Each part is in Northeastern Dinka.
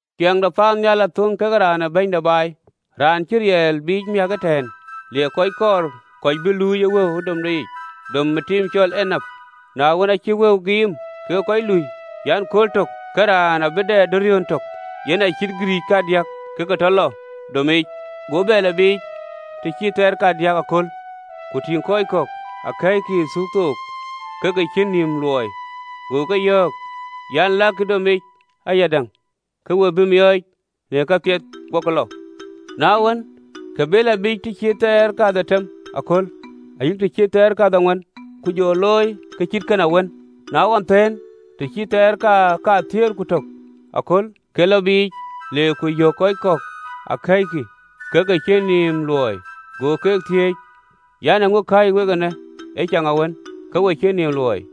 Ciɛɛŋ de paannhial athöŋ ke raan ee bɛ̈ny de baai, raan cï riɛɛl biic miäk ëtɛ̈ɛ̈n, le kɔc kɔɔr, kɔc bï luui ë wëu ë domde yic, dom ë tim cɔl enap. Na wën, aacï wëu giim kekë kɔc lui an, “Kööl tök ke raan abï dɛ denariɔn tök, (yen acït gïrïïc kadiäk), ke ke tɔ lɔ domic. Go bɛ lɔ biic të cït thaar kadiäk aköl, ku tïŋ kɔc kɔ̈k akɛ̈ɛ̈ckï ë thuuk thok, ke ke cïn nïïm luɔi, go ke yɔ̈ɔ̈k an, “Lakï domic ayadäŋ ke we bä miɔɔc në kapiɛth. Gokï lɔ. Na wën, ke be lɔ biic të cït thaar kadhetem aköl, ayï të cït thaar kadhetem, ku jɔ looi ke cït kën awën. Na ɣɔn thëën, të cït thaar kathiëër ku tök aköl, ke lɔ biic, le ku yök kɔc kɔ̈k akɛ̈ɛ̈ckï ke ke cïn nïïm luɔi, go ke thiëëc an, ‘Eeŋö kääc wek eenë ëcaŋawën, ke we cïn nïïm luɔi?’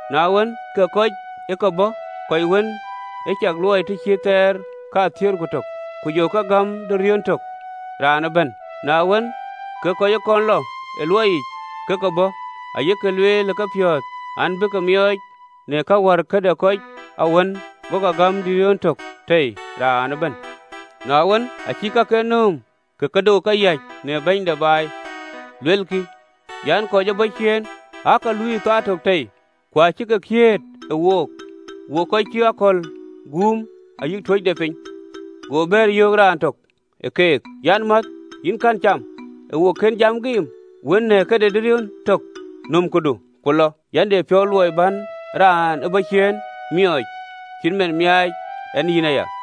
Na wën, ke kɔc ë ke bɔ̈, kɔc wën ë cak luɔi të cït thaar kathiëër ku tök, ku jɔ ke gäm denariɔn tök raan ëbɛ̈n. Na wën, ke kɔc ë kɔn lɔ ë luɔi yic ke ke bɔ̈, ayek lueel ë kepiɔ̈ɔ̈th an, bïï ke miɔɔc në kë wär këde kɔc awën, go ke gäm denariɔn tök tei raan ëbɛ̈n. Na wën, acïk kaken nööm, ke ke dok ë ke yäc në bɛ̈ny de baai. Luelkï an, ‘Kɔc ë bɔ̈ ciëën aake lui ë thaar tök tei, ku acï ke kiëët ë wook, wok kɔc cï akɔ̈l guum, ayï tuöc de piny!’ Go bɛ̈ɛ̈r, yöök raan tök ë keek an, ‘Mäth, yïn kɛ̈n cam, ë wo kën jam giim wën në këde denariɔn tök? Nöm këdu, ku lɔ, yɛn de piɔ̈u luɔi bän raan ë bɔ̈ ciëën miɔɔc, acït man miaac ɛn yïn aya.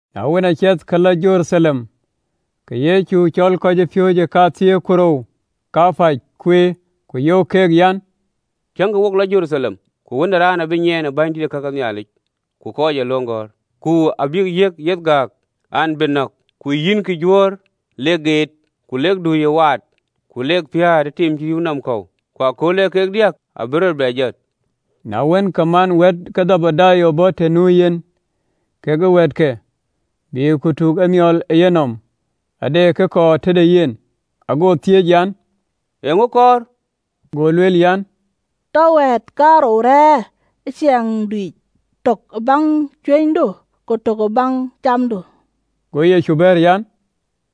Na wën, aa ciɛth ke lɔ Jeruthalem, ke Yecu cɔl kɔcpiööcë kathiëër ku rou, ku yöök keek an, “Tiëŋkï, wo lɔ Jeruthalem, ku Wën ë Raan abï nyiën bänydït ke ka ke Nhialic ku kɔc ee löŋ gɔ̈ɔ̈r. Ku abïk yiëk yeth gääk, ke bïï nɔ̈k, ku yïnkï Juöör lek geet, ku lek dui ë waat, ku lek piäät ë tim cï rïïu nɔm kɔ̈u, ku ëkööl ee kek diäk abï rɔt bɛ jɔt.” Na wën, ke man wɛ̈ɛ̈t ke Dhebedayo bɔ̈ të nu yen kekë wɛ̈ɛ̈tke, bïï ku tuk emiɔl ë yenɔm, ade kë kɔɔr tëde yen. Ago thiëëc an, “Eeŋö kɔɔr?” Go lueel an, “Tɔ wɛ̈ɛ̈tkiënë kaarou rëër ë ciɛɛŋdu yic, tök ë baŋ cuënydu, ku tök ë baŋ camdu.” Go bɛ̈ɛ̈r an,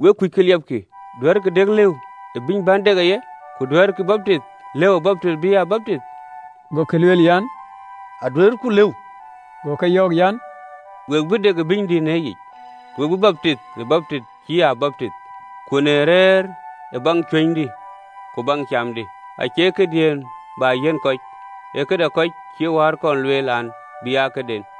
“Wek kuc ke liɛpkï. Duɛ̈ɛ̈rkï dek lëu ë bïny bän dek ë ye, ku duɛ̈ɛ̈rkï baptith lëu baptinh bï a baptith?” Gokï bɛ̈ɛ̈r an, “Aduëërku lëu.” Go ke yɔ̈ɔ̈k an, “We bï dek ë bïnydï në yic, ku we bï baptith ë baptinh cï a baptith, ku rëër ë baŋ cuënydï ku baŋ camdï acie këdiën bä yiɛ̈n kɔc, ee këde kɔc cïï wäär kɔn lueel an, bï aa këden.”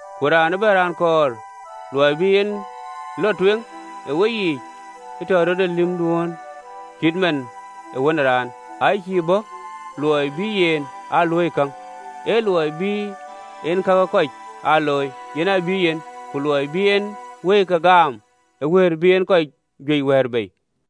ku raan ëbɛ̈n raan kɔɔr luɔi bï en lɔ tueŋ ë weyiic, ë tɔ rɔt ë lïmdun, cït man ë Wën ë Raan, aa cïï bɔ̈ luɔi bï yen aa luöi käŋ, ee luɔi bï en ka ke kɔc aa looi, yen aa bï yen, ku luɔi bï en wëike gam ë wëër bï en kɔc juëc wɛ̈ɛ̈r bei.”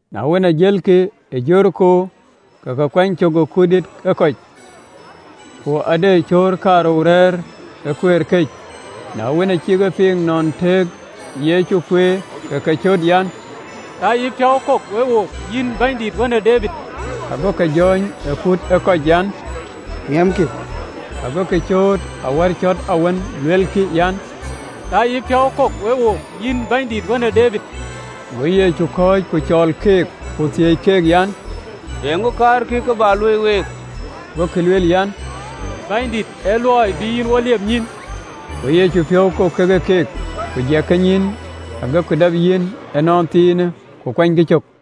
Na wën, aa jëlkï ë Jeriko, ke kuany cök ë kut dïït ë kɔc. Ku de cöör kaarou rɛ̈ɛ̈r ë kueer këc, na wën, acïk e piŋ nɔn tëëkë Yecu kueer, ke ke cöt an, “Tɔ yïpiɔ̈u kok we wook, yïn Bɛ̈nydït, wën ë Debid!” Ago ke jɔ̈ɔ̈ny ë kut ë kɔc an, miɛmkï, agokï cööt awär cɔ̈t awën, luelkï an, “Tɔ yïpiɔ̈u kok we wook, yïn Bɛ̈nydït, wën ë Debid!” Go Yecu keek thiëëc an, “Eeŋö kaarkï kë bä luöi week?” Gokï lueel an, “Bɛ̈nydït, ë luɔi bï yïn wo liep nyïïn!” Go Yecu piɔ̈u kok kekë keek, ku jɛk kenyïïn, agokï dap yïn ënɔnthiinë, ku kuanykï cök.